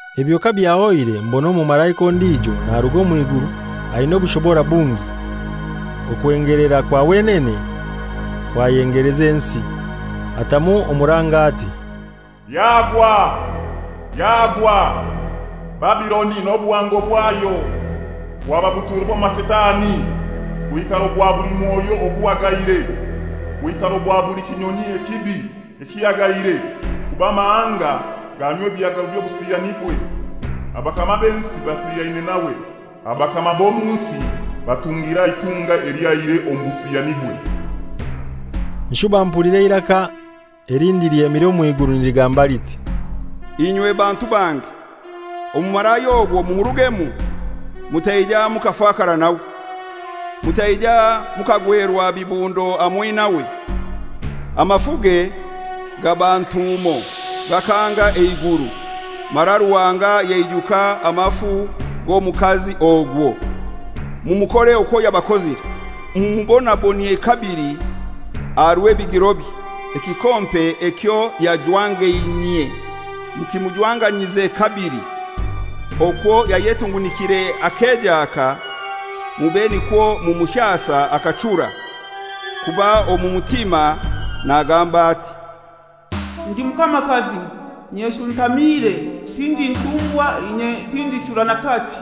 Ebyo kabyahoire mbona omumalaika ondijo naruga omw'iguru aina obushobora bungi. Okwengelera kwa wenene kwayengeleza ensi. Atamu omuranga ati, «Yagwa, yagwa, Babiloni n'obuhango bwayo! Bwaba buturo bw'amasitani, bwikaro bwa buli mwoyo oguhagaire, bwikaro bwa buli kinyonyi ekibi ekihagaire. Kuba amahanga ganywa ebihagaro by'obusiyanibwe, abakama b'ensi basiyaine nawe, abakama b'omu nsi batungiire aha itunga elyo aihire omu busiyanibwe.» Nshuba mpulira eiraka elindi lyemire omw'iguru niligamba liti, «Inywe bantu bange, omumalaya ogwo mumurugemu, mutaija mukafakara nawe, mutaija mukagwerwa bibundo hamoi nawe; amafuge gaaba ntuumo gakanga eiguru, mara Ruhanga yaijuka amafu g'omukazi ogwo. Mumukore okwo yabakozire, mumubonabonyie kabili aha rw'ebigirobye; ekikompe ekyo yajwangainyie, mukimujwanganyize kabili. Okwo yayetungunikire akejaaka, mube nikwo mumushasa akachura. Kuba omu mutima nagamba ati, ‹Ndi mukamakazi, nyeshuntamiire, tindi ntumbwakazi, inye tindichura n'akati.›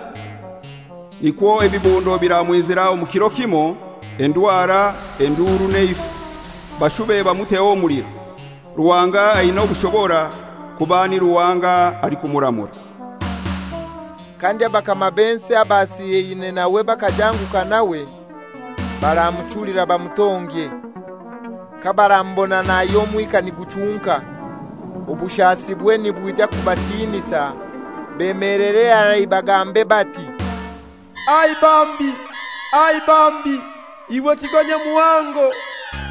Nikwo ebibundo biramwizira omu kiro kimoi, endwara, enduru n'eifa, bashube bamuteho omuliro; Ruhanga aina obushobora, kuba ni Ruhanga alikumuramura.» Kandi abakama b'ensi abasiyaine nawe bakajanguka nawe, baramuchulira bamutongye, kabaramubona nahya omwika niguchunka. Obushasibwe nibwija kubatinisa, bemelere harai bagambe bati, «Ai bambi, ai bambi! Iwe kigo nyamuhango,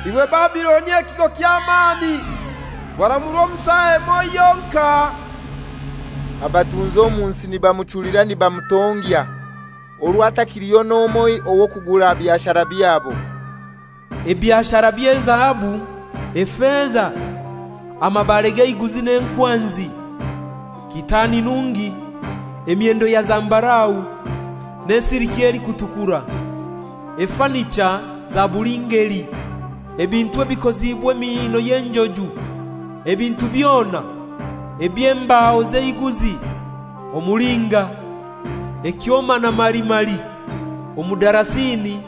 iwe Babiloni ekigo ky'amani! Waramurwa omu saa emoi yonkai.» Abatunzi omu nsi nibamuchulira nibamutongya, orwo hatakiliyo n'omoi wa kugura byashara byabo, ebyashara by'ezahabu, efeza, amabare g'eiguzi n'enkwanzi, kitaani nungi, emyendo ya zambarau, n'esiliki elikutukura, efanicha za buli ngeli, ebintu ebikoziibwe emiino y'enjuju, ebintu byona eby'embaho z'eiguzi, omulinga, ekyoma na marimari, omudarasini,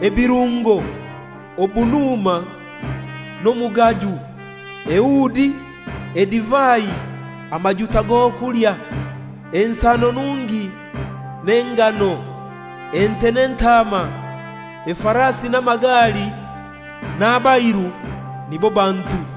ebirungo, obunuma, n'omugaju, eudi, edivai, amajuta g'okulya, ensano nungi n'engano, ente n'entaama, efarasi n'amagali, n'abairu, nibo bantu.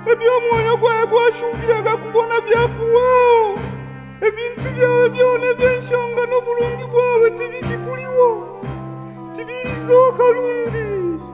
«Eby'omwoyo gwawe washuubiraga kubona byakuhwaho, ebintu byawe byona eby'enshonga n'oburungi bwawe tibikikuliho, tibilizoka rundi!»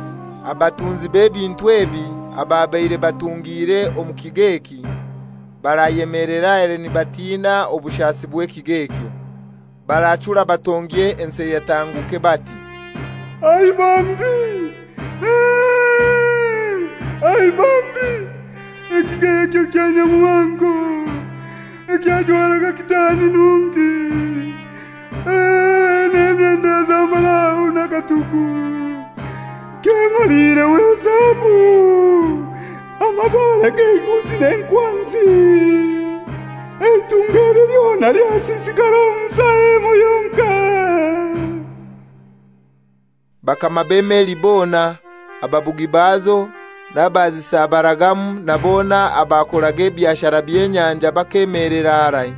Abatunzi b'ebintu ebi, ababaire batungiire omu kigo eki, barayemelera harai nibatiina obushasi bw'ekigo ekyo. Barachura batongye ensi eyatanguke, bati, «Ai bambi, ai bambi, ekigo ekyo nyamuhango, ekyajwaraga kitaani nungi, n'emyendo ya zambarau na katuku, kyemaliireho ezahabu, amabare g'eiguzi n'enkwanzi! Eitunga eli lyona lyasisikara omu saa emoi yonkai.» Bakama b'emeli bona, ababugi bazo n'abazisabaragamu na bona abakoraga ebyashara by'enyanja bakemelera harai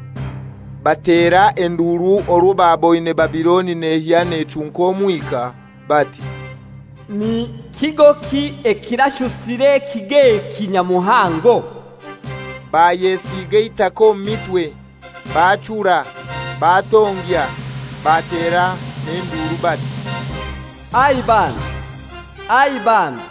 batera enduru orwo baboine Babiloni nehya nechunka omwika, bati, « Ni kigoki ekirashusire ekigo eki nyamuhango?» Bayesiiga eitaka omu mitwe, bachura, batongya, batera n'enduru bati, «Ai bambi, ai bambi,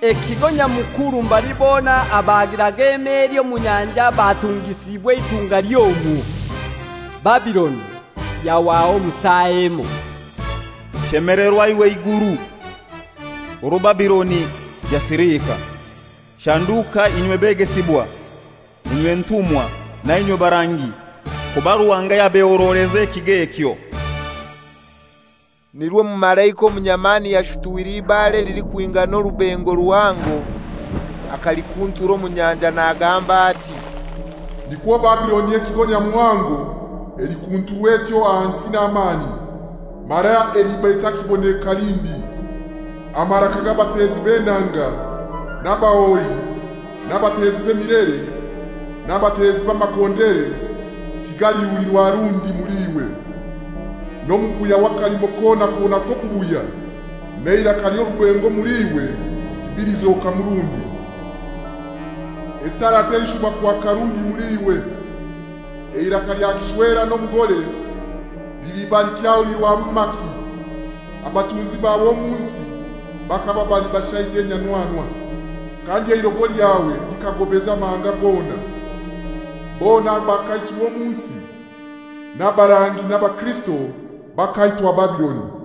ekigo Nyamukuru mbali bona abagiraga emeli omu nyanja batungisiibwe eitunga ly'omwo! Babiloni yahwaho omu saa emoi. Shemelerwa iwe iguru orwo Babiloni yasilika, shanduka inywe begesibwa, inywe ntumwa na inywe barangi, kuba Ruhanga yabehoroleza ekigo ekyo!» Nirwo omumalaika omunyamani yashutwire eibare elilikwigana orubengo ruhango akalikuntura omu nyanja nagamba ati, «Nikwo Babiloni ekigo nyamuhango elikunturwa etyo ahansi n'amani, mara eliba etakiboneka lindi. Amaraka g'abatezi b'enanga, n'abahoyi, n'abatezi b'emilere, n'abatezi b'amakondere, tigalihulirwa rundi muli iwe. N'omubuya w'akalimo kona kona k'obubuya, n'eiraka ly'orubengo omul'iwe tibilizokamu rundi. Etara telishuba kwaka rundi muli iwe. Eiraka lya kishwera n'omugore liliba likyahulirwamu maki? Abatunzi bawe omu nsi bakaba bali bashaija enyanwanwa, kandi eirogo lyawe likagobeza amahanga gona. Bona abakaisirwe omu nsi, n'abarangi n'abakirisito, bakaitwa Babiloni.»